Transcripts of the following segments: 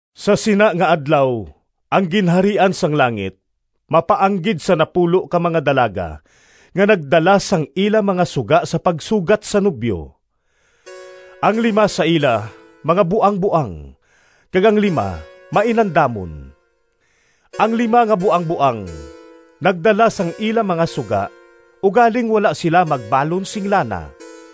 “Sa sina nga adlaw ang Ginharian sang langit mapaanggid sa napulo ka mga dalaga nga nagdala sang ila mga suga sa pagsugat sa nobyo. Ang lima sa ila mga buangboang kag ang lima mainandamon. Ang lima nga buangboang nagdala sang ila mga suga ugaling wala sila magbalon sing lana.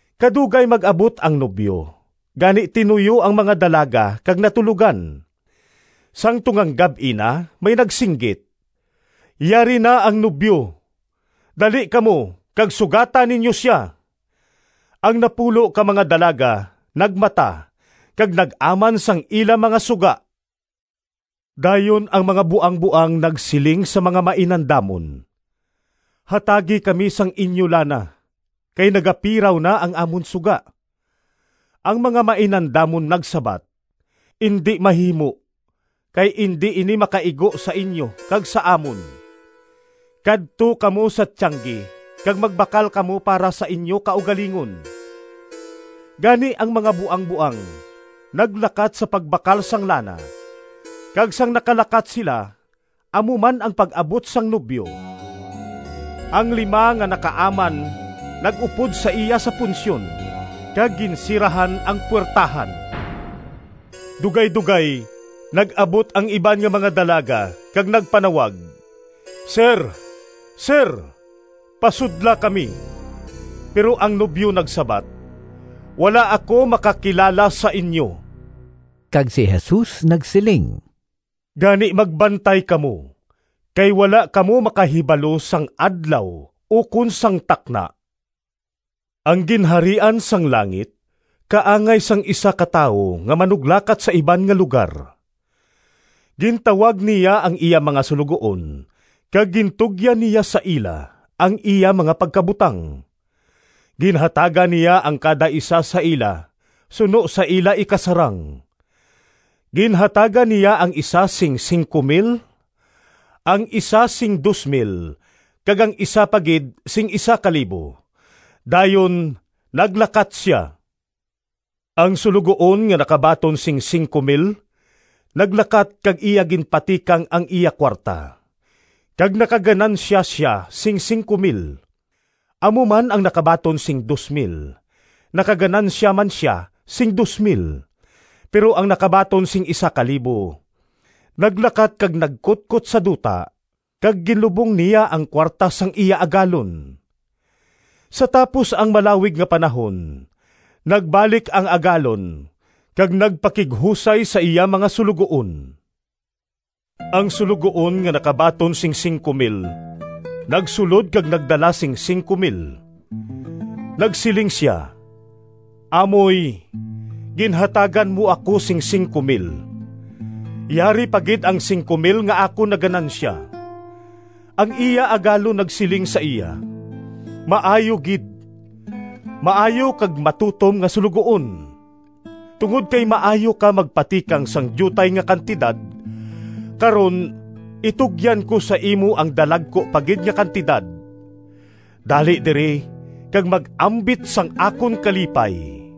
Kadugay mag-abot ang nobyo, gani tinuyo ang mga dalaga kag natulogan. “Sang tungang gab-i na may nagsinggit, ‘Yari na ang nobyo! Dali kamo kag sugata ninyo sia!’ Ang napulo ka mga dalaga nagmata kag nag-aman sang ila mga suga. Dayon ang mga buangboang nagsiling sa mga mainandamon, ‘Hatagi kami sang inyo lana, kay nagapiraw na ang amon suga.’ Ang mga mainandamon nagsabat, ‘Indi mahimo, kay indi ini makaigo sa inyo kag sa amon. Kadto kamo sa tiyanggi kag magbakal kamo para sa inyo kaugalingon.’ Gani ang mga buangboang naglakat sa pagbakal sang lana, kag sang nakalakat sila amo man ang pag-abot sang nobyo. Ang lima nga nakaaman nag-upod sa iya sa punsyon, kag ginsirahan ang puwertahan. “Dugaydogay nag-abot ang iban nga mga dalaga kag nagpanawag, ‘Sir, sir! Pasudla kami!’ Pero ang nobyo nagsabat, ‘Wala ako makakilala sa inyo.’” Kag si Jesus nagsiling, “Gani magbantay kamo, kay wala kamo makahibalo sang adlaw ukon sang takna.” “Ang Ginharian sang langit kaangay sang isa ka tawo nga manuglakat sa iban nga lugar. Gintawag niya ang iya mga suloguon kag gintugyan niya sa ila ang iya mga pagkabutang. Ginhatagan niya ang kada isa sa ila suno sa ila ikasarang. Ginhatagan niya ang isa sing P5,000, ang isa sing P2,000, kag ang isa pa gid sing P1,000. Dayon naglakat sia. Ang suloguon nga nakabaton sing P5,000 naglakat kag iya ginpatikang ang iya kuwarta, kag nakaganansya sia sing P5,000. Amo man ang nakabaton sing P2,000, nakaganansya man sia sing P2,000. Pero ang nakabaton sing P1,000 naglakat kag nagkutkot sa duta, kag ginlubong niya ang kuwarta sang iya agalon. “Sa tapos ang malawig nga panahon nagbalik ang agalon kag nagpakighusay sa iya mga suloguon. Ang suloguon nga nakabaton sing P5,000 nagsulod kag nagdala sing P5,000. Nagsiling sia, ‘Amoy, ginhatagan mo ako sing P5,000. Yari pa gid ang P5,000 nga akon naganansya.’ Ang iya agalon nagsiling sa iya, ‘Maayo gid, maayo kag matutom nga suloguon! Tungod kay maayo ka magpatikang sang diutay nga kantidad, karon itugyan ko sa imo ang dalagku pa gid nga kantidad. Dali diri kag mag-ambit sang akon kalipay!’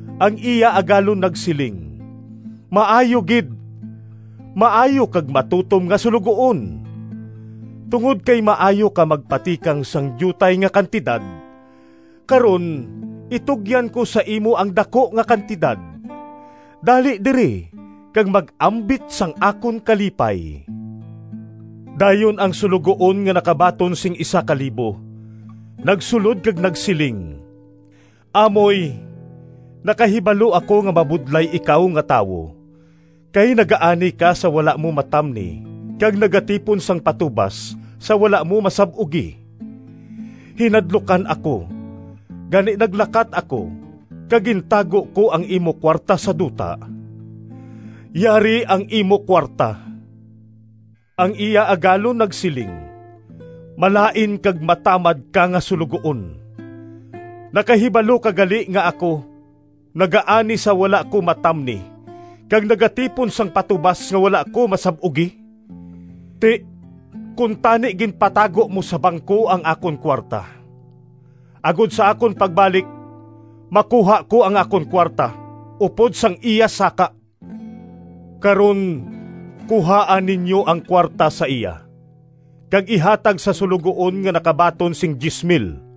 Ang iya agalon nagsiling, ‘Maayo gid, maayo kag matutom nga suloguon! Tungod kay maayo ka magpatikang sang diutay nga kantidad, karon itugyan ko sa imo ang daku nga kantidad. Dali diri kag mag-ambit sang akon kalipay!’ Dayon ang suloguon nga nakabaton sing P1,000 nagsulod kag nagsiling, ‘Amoy, nakahibalo ako nga mabudlay ikaw nga tawo, kay nagaani ka sa wala mo matamni kag nagatipon sang patubas sa wala mo masab-ugi. Hinadlukan ako, gani naglakat ako kag gintago ko ang imo kuwarta sa duta. Yari ang imo kuwarta.’ Ang iya agalon nagsiling, ‘Malain kag matamad ka nga suloguon! Nakahibalo ka gali nga ako nagaani sa wala ko matamni kag nagatipon sang patubas nga wala ko masab-ugi? Ti, kuntani ginpatago mo sa bangko ang akon kuwarta, agod sa akon pagbalik makuha ko ang akon kuwarta upod sang iya saka. Karon, kuhaa ninyo ang kuwarta sa iya kag ihatag sa suloguon nga nakabaton sing P10,000.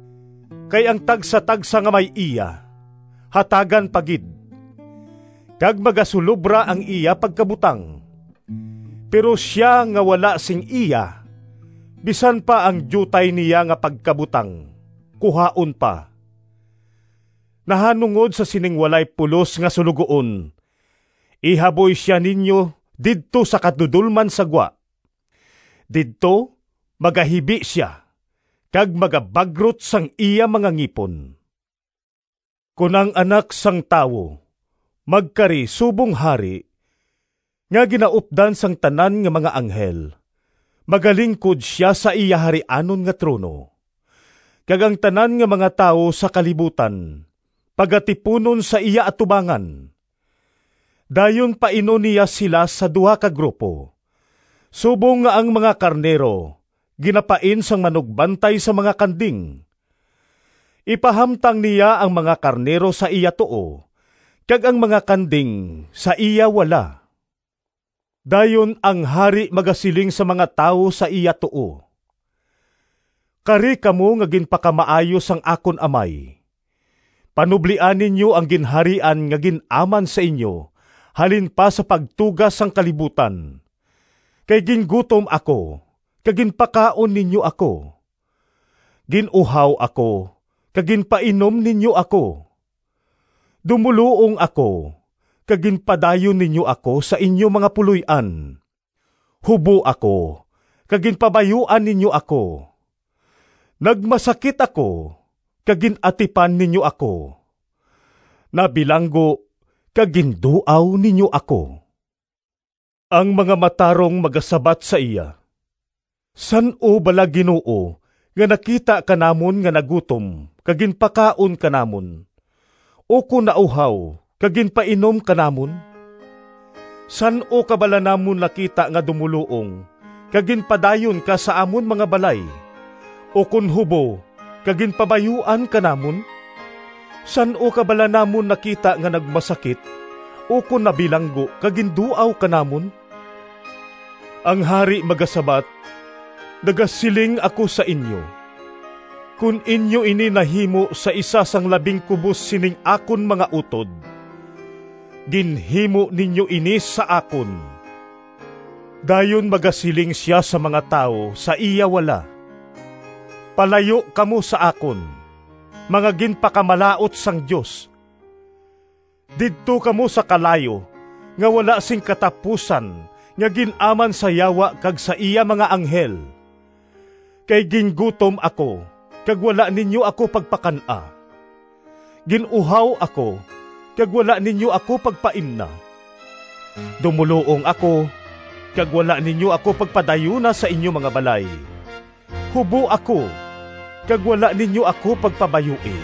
Kay ang tagsatagsa nga may iya, hatagan pa gid, kag magasulobra ang iya pagkabutang. Pero sia nga wala sing iya, bisan pa ang diutay niya nga pagkabutang kuhaon pa. Nahanungod sa sining walay pulos nga suloguon, ihaboy sia ninyo didto sa kadudolman sa gwa. Didto magahibi sia kag magabagrot sang iya mga ngipon.’” “Kon ang Anak sang Tawo magkari subong Hari, nga ginaupdan sang tanan nga mga anghel, magalingkod sia sa iya harianon nga trono, kag ang tanan nga mga tawo sa kalibutan pagatipunon sa iya atubangan. Dayon painon niya sila sa duha ka grupo, subong nga ang mga karnero ginapain sang manugbantay sa mga kanding. Ipahamtang niya ang mga karnero sa iya tuo, kag ang mga kanding sa iya wala. Dayon ang Hari magasiling sa mga tawo sa iya tuo, ‘Kari kamo nga ginpakamaayo sang akon Amay. Panublia ninyo ang Ginharian nga gin-aman sa inyo halin pa sa pagtuga sang kalibutan. Kay gingutom ako kag ginpakaon ninyo ako, gin-uhaw ako kag ginpainom ninyo ako, dumoluong ako kag ginpadayon ninyo ako sa inyo mga puloy-an, hubo ako kag ginpabayuan ninyo ako, nagmasakit ako kag gin-atipan ninyo ako, nabilanggo kag ginduaw ninyo ako.’ Ang mga matarong magasabat sa iya, ‘San-o bala Ginoo nga nakita ka namon nga nagutom kag ginpakaon ka namon, ukon nauhaw kag ginpainom ka namon? San-o ka bala namon nakita nga dumoluong kag ginpadayon ka sa amon nga mga balay, ukon hubo kag ginpabayuan ka namon? San-o ka bala namon nakita nga nagmasakit ukon nabilanggo kag ginduaw ka namon?’ Ang Hari magasabat, ‘Nagasiling ako sa inyo, kon inyo ini nahimo sa isa sang labing kubos sining akon mga utod, ginhimo ninyo ini sa akon!’ “Dayon magasiling sia sa mga tawo sa iya wala, ‘Palayo kamo sa akon, mga ginpakamalaut sang Dios! Didto kamo sa kalayo nga wala sing katapusan nga gin-aman sa Yawa kag sa iya mga anghel! Kay gingutom ako kag wala ninyo ako pagpakan-a, gin-uhaw ako kag wala ninyo ako pagpaimna, dumoluong ako kag wala ninyo ako pagpadayuna sa inyo mga balay, hubo ako kag wala ninyo ako pagpabayui,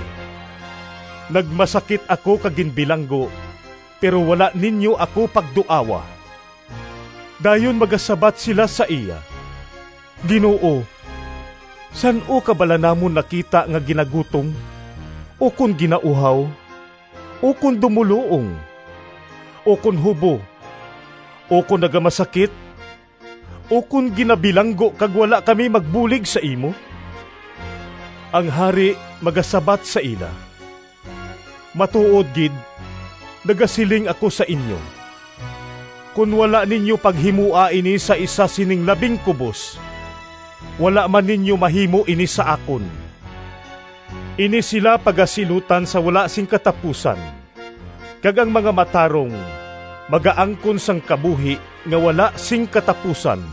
nagmasakit ako kag ginbilanggo pero wala ninyo ako pagduawa.’ Dayon magasabat sila sa iya, ‘Ginoo, san-o ka bala namon nakita nga ginagutom, ukon ginauhaw, ukon dumoluong, ukon hubo, ukon nagamasakit, ukon ginabilanggo kag wala kami magbulig sa imo?’ Ang Hari magasabat sa ila, ‘Matuod gid nagasiling ako sa inyo, kon wala ninyo paghimoa ini sa isa sining labing kubos, wala man ninyo mahimo ini sa akon.’ Ini sila pagasilutan sa wala sing katapusan, kag ang mga matarong magaangkon sang kabuhi nga wala sing katapusan.”